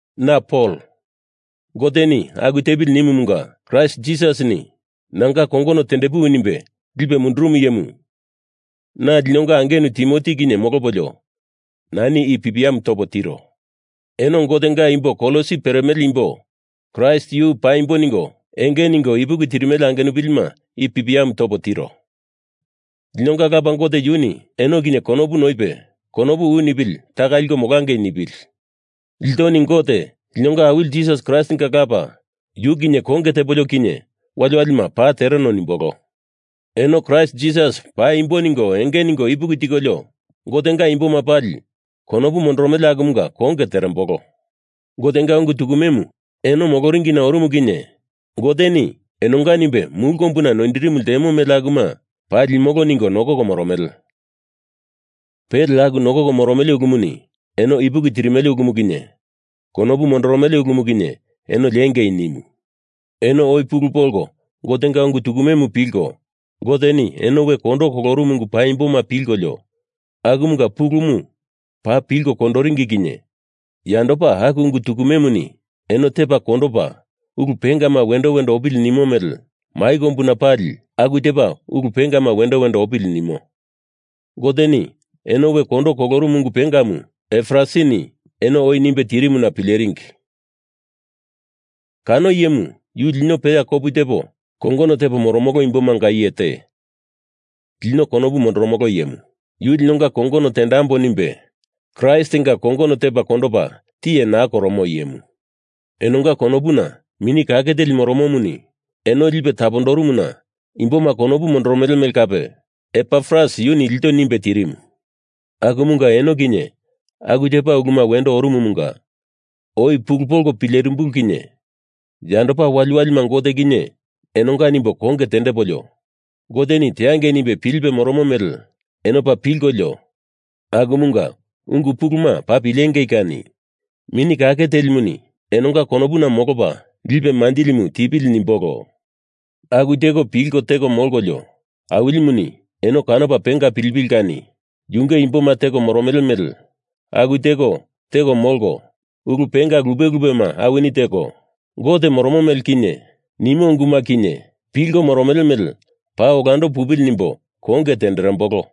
Na Pol, Goteni aku tepili nimumunga Kraist Jisasini nanga kongono tendepuwi nimbe lipe mundurumu iyemu, na linonga angenu Timoti kinye molopolio nani i pipiamu topo tiro. Eno Gotenga imbo Kolosi peremele imbo, Kraist yu paimbo ningo enge ningo ipuki tirimele angenupilima i pipiamu topo tiro. Linonga Lapa Gote yuni eno kinye konopu noipe konopu u nipili taka liko molangei nipili. Iltoni Gote, linonga Awili Jisas Kraistinga Lapa yu kinye konge tepolio kinye waliwalima paa tereno nimbolo. Eno Kraist Jisas paimbo ningo enge ningo ipuki tikolio Gotenga imboma pali konopu mondoromele akumunga konge terembolo. Gotenga ungu tukumemu eno moloringina orumu kinye Goteni enonga nimbe mulu kombuna noindirimu ltemo mele akuma paa limolo ningo nokoko moromele. Pele aku nokoko moromele ulumuni eno ipuki tirimele ulumu kinye konopu mondoromele ulumu kinye, eno liengei nimu. Eno oi pulu polko Gotenga ungu tukumemu pilko Goteni eno we kondo kolorumu ungu paimboma pilkolio akumunga pulumu paa pilko kondoringi kinye yandopa aku ungu tukumemuni eno tepa kondopa ulu pengama wendo wendo opili nimo mele mai kombumanga pali aku tepa ulu pengama wendo wendo opili nimo. Goteni eno we kondo kolorumu ungu pengamu Epafrasini eno oi nimbe tirimuna pileringi. Kano iyemu yu lino peya kopu tepo kongono tepo moromolo imbomanga iye te, lino konopu mondoromolo iyemu. Yu linonga kongono tendambo nimbe Kraistinga kongono tepa kondopa tiye naa koromo iyemu. Enonga konopuna Mini Kake Teli moromomuni eno lipe tapondorumuna imboma konopu mondoromele mele kape Epafras yuni ilto nimbe tirimu. Akumunga eno kinye aku tepa uluma wendo orumumunga oi pulu polko pilerimbulu kinye yandopa wali wali Gote kinye enonga nimbo konge tendepolio, Goteni teangei nimbe pilipe moromo mele eno paa pilkolio, akumunga ungu puluma paa pilengei kani Mini Kake Telimu enonga konopuna molopa lipe manjilimu tipili nimbolo. Aku teko pilko teko molkolio, Awilimuni eno kanopa penga pilipili kani yunge imboma teko moromele mele aku teko teko molko ulu penga lupe lupema awini teko, Gote moromo mele kinye, nimo unguma kinye, pilko moromele mele paa olando pupili nimbo konge tenderembolo.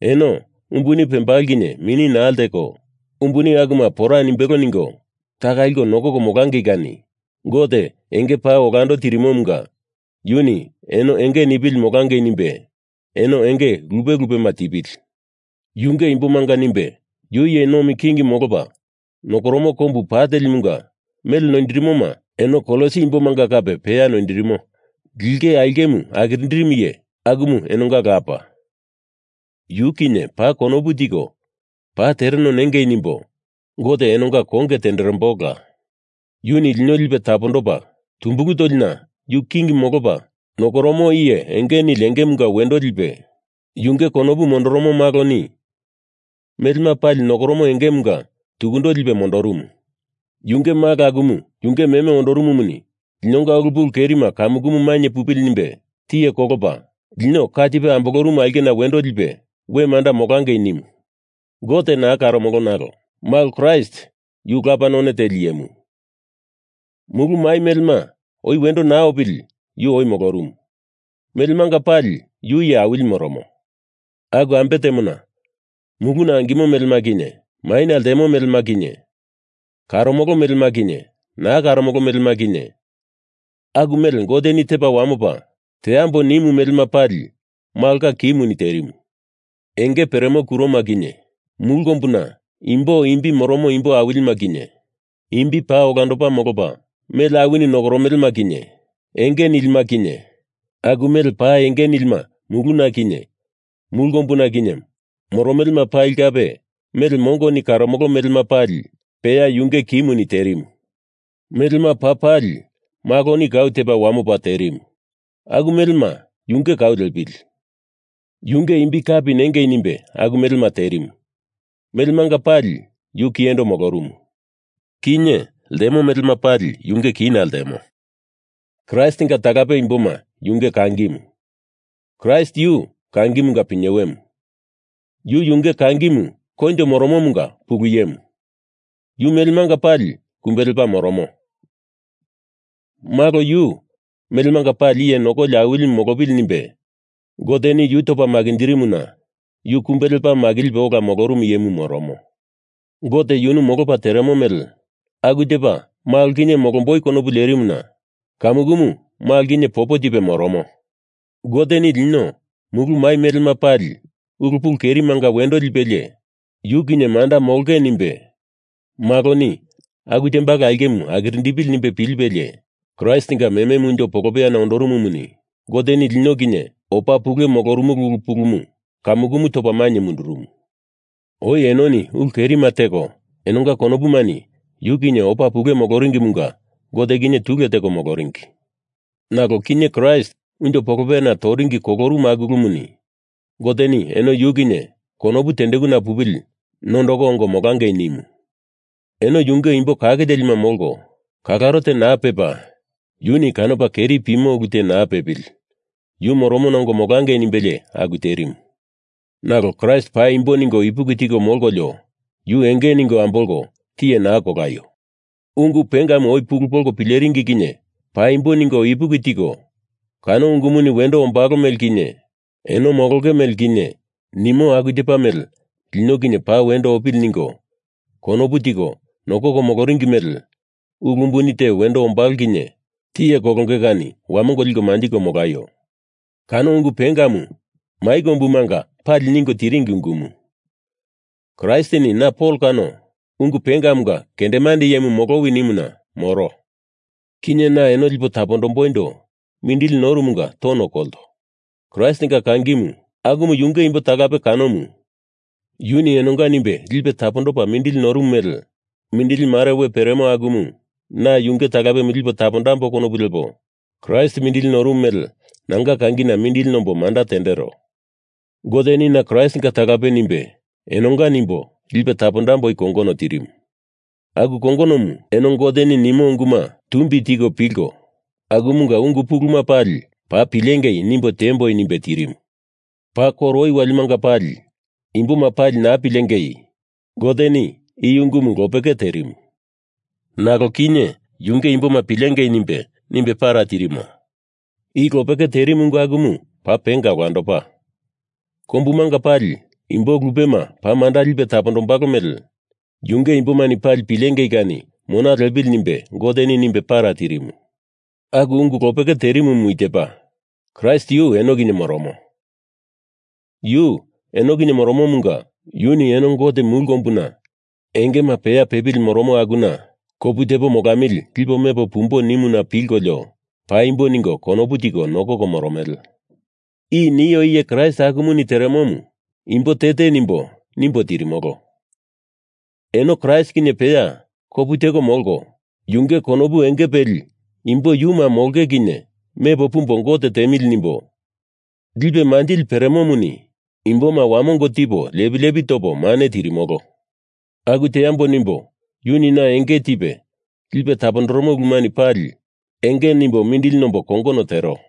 Eno, umbuni pembalo kinye mini naa leko, umbuni akuma pora nimbelo ningo taka liko nokoko molangei kani Gote enge paa olando tirimomunga yuni eno enge nipili molangei nimbe eno enge lupe lupema tipili. Yunge imbomanga nimbe yu iye nomi king molopa nokoromo kombu pa telimunga mele noindirimoma eno Kolosi imbomanga kape peya noindirimo linge aulkemu akirindirimu iye, akumu enonga Lapa, yu kinye paa konopu tiko paa tereno nengei nimbo Gote enonga konge tenderembolola. Yuni lino lipe tapondopa tumbulu tolina yu king molopa nokoromo iye enge nili engemunga wendo lipe, yunge konopu mondoromo Maloni melema pali nokoromo engemunga tukundo lipe mondorumu. Yunge Malo akumu yunge meme ondorumumuni linonga ulu pulu kerima kamukumu mainye pupili nimbe tiye kolopa, lino ka tipe ambolorumu aulkena wendo lipe we manda molangei nimu. Gote naa karomolo nalo Gotenga Malo Kraist yunge Lapa none teli iyemu. Mulu mai melema oi wendo naa opili yu oi molorumu. Melemanga pali yu iye awili moromo. Aku ambe temona, muluna angimo melema kinye maina ltemo melema kinye, karomolo melema kinye naa karomolo melema kinye, aku mele Goteni tepo wamopo teambo nimu melema pali Malonga kimuni terimu. Enge peremo kuroma kinye, mulu kombuna imbo imbi moromo imbo awilima kinye, imbi paa olandopa molopa mele awini nokoromelema kinye, enge nilima kinye, aku mele paa enge nilima muluna kinye mulu kombuna kinye moromelema pali kape mele mongoni karomolo melema pali peya yunge kimuni terimu. Melema paa pali Maloni kau tepa wamopa terimu. Aku melema yunge kau liepili. Yunge imbi kapi nengei nimbe aku melema terimu Melemanga pali yu kiyendo molorumu. Kinye ltemo melema pali yunge kina ltemo. Kraistinga talape imboma yunge kangimu, Kraist yu kangimunga pinyewemu. Yu yunge kangimu koinjo moromomunga pulu iyemu. Yu melemanga pali kumbe lepa moromo Malo, yu melemanga pali iye nokoli Awilimu molopili nimbe Goteni yu topa makinjirimuna yu kumbe lepa makilipe ola molorumu iyemu moromo. Gote yunu molopa teremo mele aku tepa Malo kinye molomboi konopu lerimuna kamukumu Malo kinye popo tipe moromo. Goteni lino mulu mai melema pali ulu pulu kerimanga wendo lipelie yu kinye manda molongei nimbe Maloni aku tembalo aulkemu akirindepili nimbe pilipelie Kraistinga mememu unjo polopeyana ondorumumuni Goteni lino kinye opa pule molorumulu ulu pulumu kamukumu topa mainye mundurumu. Oi enoni ulu kerima teko enonga konopumani yu kinye opa pule moloringimunga Gote kinye tule teko moloringi. Nalo kinye Kraist unjo polopeyana toringina kolorumu aku ulumuni Goteni eno yu kinye konopu tendekuna pupili nondoko ongo molangei nimu. Eno yunge imbo kake telima molko, kalaro te naa pepa, yuni kanopa keri pimo ulu te naa pepili yu moromona ongo molangei nimbelie aku terimu. Nalo Kraist paimbo ningo ipuki tiko molkolio yu enge ningo ambolko tiye naa kolaio. Ungu pengamu oi pulu polko pileringi kinye paimbo ningo ipuki tiko kano ungumuni wendo ombalo mele kinye eno molonge mele kinye nimo aku tepa mele lino kinye paa wendo opili ningo konopu tiko nokoko moloringi mele ulu umbuni te wendo ombalo kinye tiye kolonge kani wamongo liko manjiko molaio. Kano ungu pengamu mai kombumanga pali ningo tiringi ungumu. Kraistini na Pol kano ungu pengamunga kendemande iyemu molowi nimuna moro. Kinye na eno lipo tapondomboindo mindili norumunga tono kolto. Kraistinga kangimu, akumu yunge imbo talape kanomu, yuni enonga nimbe lipe tapondopa mindili norumu mele mindili mare we peremo akumu na yunge talapemu lipo tapondambo konopu lepo Kraist mindili norumu mele nanga kangina mindili nombo manda tendero. Goteni na Kraistinga talape nimbe enonga nimbo lipo tapondamboi kongono tirimu. Aku kongonomu eno Goteni nimo unguma tumbi tiko pilko akumunga ungu puluma pali paa pilengei nimbo tiemboi nimbe tirimu. Paa koro oi walimanga pali imboma pali naa pilengei Goteni i ungumu lopeke terimu, nalo kinye yunge imboma pilengei nimbe, nimbe para tirimo. I lopeke terimu ungu akumu paa penga olandopa, kombumanga pali imbo lupema paa manda lipe tapondombalo mele yunge imbomani pali pilengei kani mona lepili nimbe Goteni nimbe para tirimu. Aku ungu lopeke terimumu i tepa: Kraist yu eno kinye moromo. Yu eno kinye moromomunga yuni eno Gote mulu kombuna engema peya pepili moromo akuna kopu tepo molamili lipo mepo pumbo nimuna pilkolio paimbo ningo konopu tiko nokoko moromele. I nio iye Kraist akumuni teremomu imbo te te nimbo, nimbo tirimolo. Eno Kraist kinye peya kopu teko molko yunge konopu enge peli imbo yuma molonge kinye mepo pumbo Gote tiemili nimbo, lipe manjili peremomuni imboma wamongo tipo lepi lepi topo mane tirimolo. Aku teambo nimbo yuni na enge tipe lipe tapondoromo ulumani pali enge nimbo mindili nombo kongono tero.